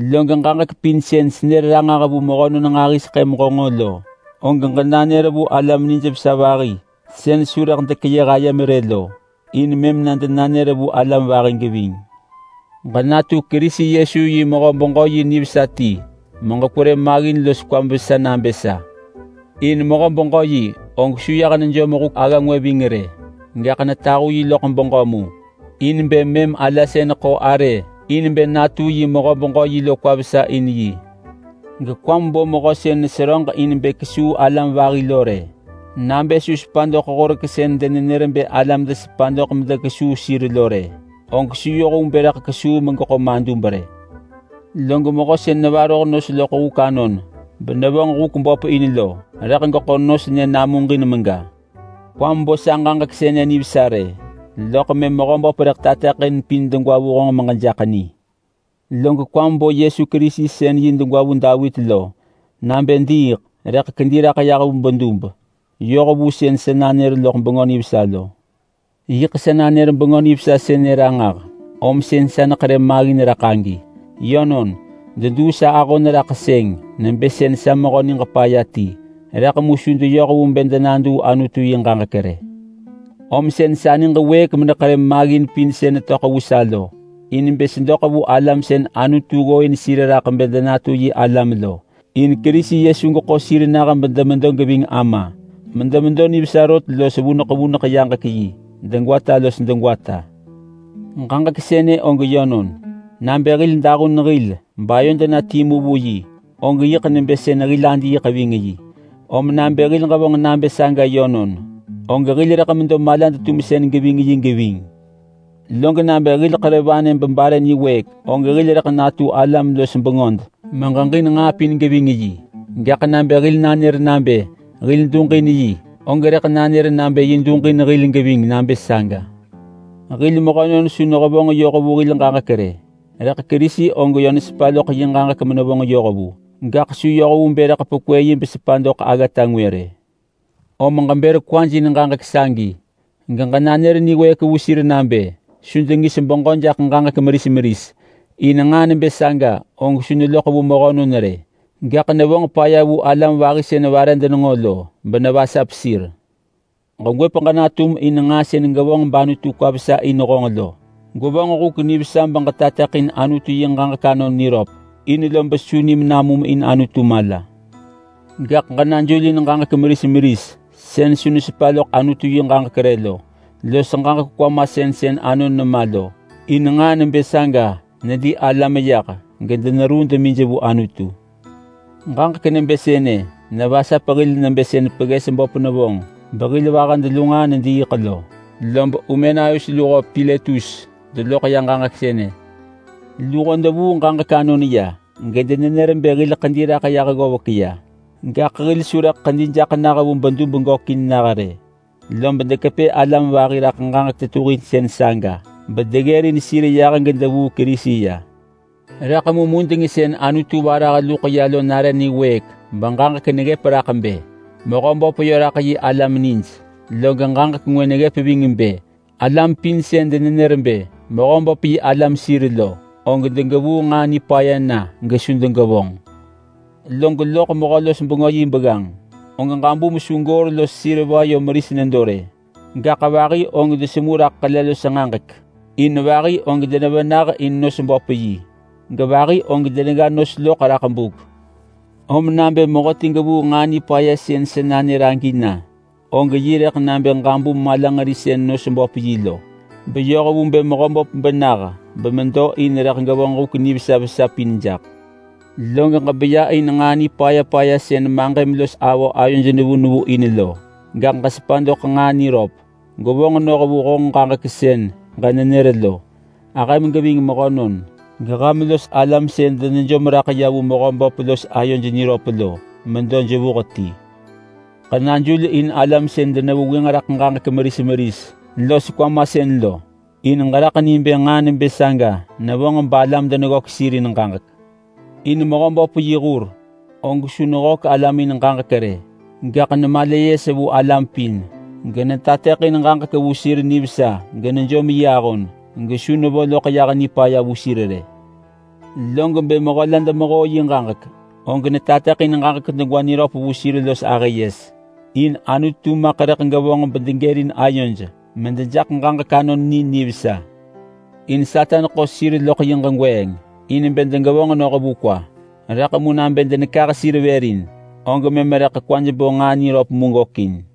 Log ġaġek pin sën senër ranġah vu mehönon nġahiseḳë meġenġo lo, og ġenanër vu alam nijvesa vahi sën su rëḳ dekeyëh ayem rë lo, in mëm na denanër na vu alam vahi geving. Ġenatu Kerisi Yesu yi mehö-beġö-yi nivesa ti meġekwerë maggin los kwam vesa nabë sa. In mehö-beġö-yi og su yah nejom huk agga ngwë ving rë, gaḳ netahu yi loḳ beġö mu, in bë mëm ala sën ḳo arë in bë natu yi mehö-beġö-yi lo kwa vesa in yi. Gekwam bo mehö sën neseröġ in bë kesuu alam vahi lo rë! Nabë su sepa doḳ horek sën denenër bë alam desepa doḳ medekesuu sir lo rë, og su yoh vu bë rëḳ kesuu megeḳo madub rë. Log mehö sën nevaroh nos loḳ huk anon benevonġ huk böp in lo, rëḳ geḳo nos nyë namuġin mega. Kwam bo sa ġaġek sënë nivesa rë, loḳ mëm Mehöböp rëḳ tateḳin pin degwa vu honġ meġejaḳ ni. Log kwam bo Yesu Kerisi sën yi degwa vu Davit lo, nabë diiḳ, rëḳ kedi raḳ yah vu bedub yoh vu sën sa nanër loḳ Bengö Nivesa lo. Yiḳ sa nanër Bengö Nivesa sënë ranġah, om sën sa neḳerë maggin raḳ agi. Yönon, deduu sa ahon raḳ sëng nebë sën sa mehö niġ paya ti, rëḳ mu su deyoh vu bë denaduu Anutu yi ġaġek rë. Om sën sa niġ wëëk meneḳerë maggin pin sën netöḳ vu sa lo, in bë sedoḳ vu alam sën Anutu ggooin sir raḳ bë denatu yi alam lo. In Kerisi Yesu geḳo sir nah bedemedo geving Ama medemedo nivesa rot los vuneḳ vuneḳ yaġek yi degwata los degwata. Ġaġek sënë og yönon: Nabë hil dahun hil bayod na timu vu yi, og yiḳ nebë sën hil adiiḳ ving yi. Om nabë hil ġevonġ nabë saga yönon, og hil rëḳ medo malad-tumsën geving yi geving. Log nabë hil ḳerë vanë bebare nidwëëk, og hil rëḳ natu alam los bengöd meġeġin nġaa pin geving yi. Gaḳ nabë hil nanër nabë hil duġin yi, og rëḳ nanër nabë yi duġin hil geving nabë saga. Hil mehönon su nehevonġ yoh vu hil ġaġek rë, rëḳ Kerisi og yö nesepa loḳ yi ġaġek menevonġ yoh vu. Gaḳ su yoh vu bë rëḳ pekwë yi besepa doḳ aggata ngwë rë. Om ġebër kwaj in ġaġek sagi, geġenanër niwëëk vu sir nabë su dengis beġö jaḳ ġaġek meris meris, in nġaa nebë saga og su neloḳ vu mehönon rë. Gaḳ nevonġ paya vu alam vahi sën vare denenġo lo benevasap sir. Gegwëp ġenatum in nġaa sën ġevonġ bAnutu kwa vesa in honġ lo. Gwevonġ huk nivesa beġetateḳin Anutu yi ġaġek anon niröp in lob su nim namum in Anutu mala. Gaḳ ġenajul in ġaġek meris meris sën su nesepa loḳ Anutu yi ġaġek rë lo, los ġaġek kwamasën sën anon nema lo, in nġaa nebë saga neli alam yah gedeneruu demij vu Anutu. Ġaġek nebë sënë nevasap hil nebë sën pegges böp nevonġ behil vahad lu nġaa nediiḳ lo. Lob Humenaius luho Piletus deloḳ ya nġaa sënë. Luho devuu ġaġek anon ya gedenenër bë hil ḳedi raḳ yah ggovek ya, gaḳ hil su rëḳ ḳedi jaḳ vu bedub gökin nah rë. Lob dekepë alam vahi raḳ ġaġek tetuhinsën saga bedeggërin sir yah gedevuu Kerisi ya. Rëḳ mu mudeng sën Anutu varah luḳ ya lo nare niwëëk beġaġek neggëp raḳ bë, “Mehöböp yö raḳ yi alam nij.” Log ġaġek ngwë neggëp ving bë, “Alam pin sën denenër bë Mehöböp yi alam sir lo, og degevuu nġaa nipaya na gesu degevonġ!” Log loḳ mehö-los-bengö yi begganġ, og ġabum su goor los seriva yö meris nedo rë, gaḳ vahi og desemu raḳ ḳele los nġaġek. In vahi og denevenah in nos böp yi, gevahi og denegga nos loḳ raḳ buk. Om nabë mehöti gevuu nġaa nipaya sën sa nanër agi na, og yi rëḳ nabë ġabum malanġeri sën nos böp yi lo beyoh vu bë Mehöböp benah bemedo in rëḳ gevonġ huk nivesa vesa pin jaḳ. Log ġebeya in nġaa nipaya paya sën maġëm los avö ayoj nevu nevu in lo, gaḳ ġesepa doḳ nġaa niröp. Gwevonġ noh vu honġ ġaġek sën ġenenër lo. Ahëm geving mehönon, geham los alam sën denejom raḳ ya vu Mehöböp los ayoj niröp lo medo jevuh ti. Ġenajul in alam sën denevengwënġ raḳ ġaġek meris meris los kwamasën lo, in ġeraḳ ni bë nġaa nebë saga nevonġ balam deneggök sir in ġaġek. In Mehöböp yi hur og su neggök alam in ġaġek rë, gaḳ nemala yes vu alam pin. Netateḳin ġaġek vu sir nivesa genejom yi ahon gesu nevo loḳ yah nipaya vu sir rë. Log bë mehö la demehoo yi ġaġek, og netateḳin ġaġek degwa niröp vu sir los ahë yes, in Anutu maḳ rëḳ gevonġ bedegërin ayoj medejaḳ ġaġek anon ni nivesa. In Satan ḳo sir loḳ yi ġegweeng in bë degevonġ noh vu kwa, rëḳ mu nabë denakah sir vër in, og mëm rëḳ kwaj bo nġaa niröp mu gökin.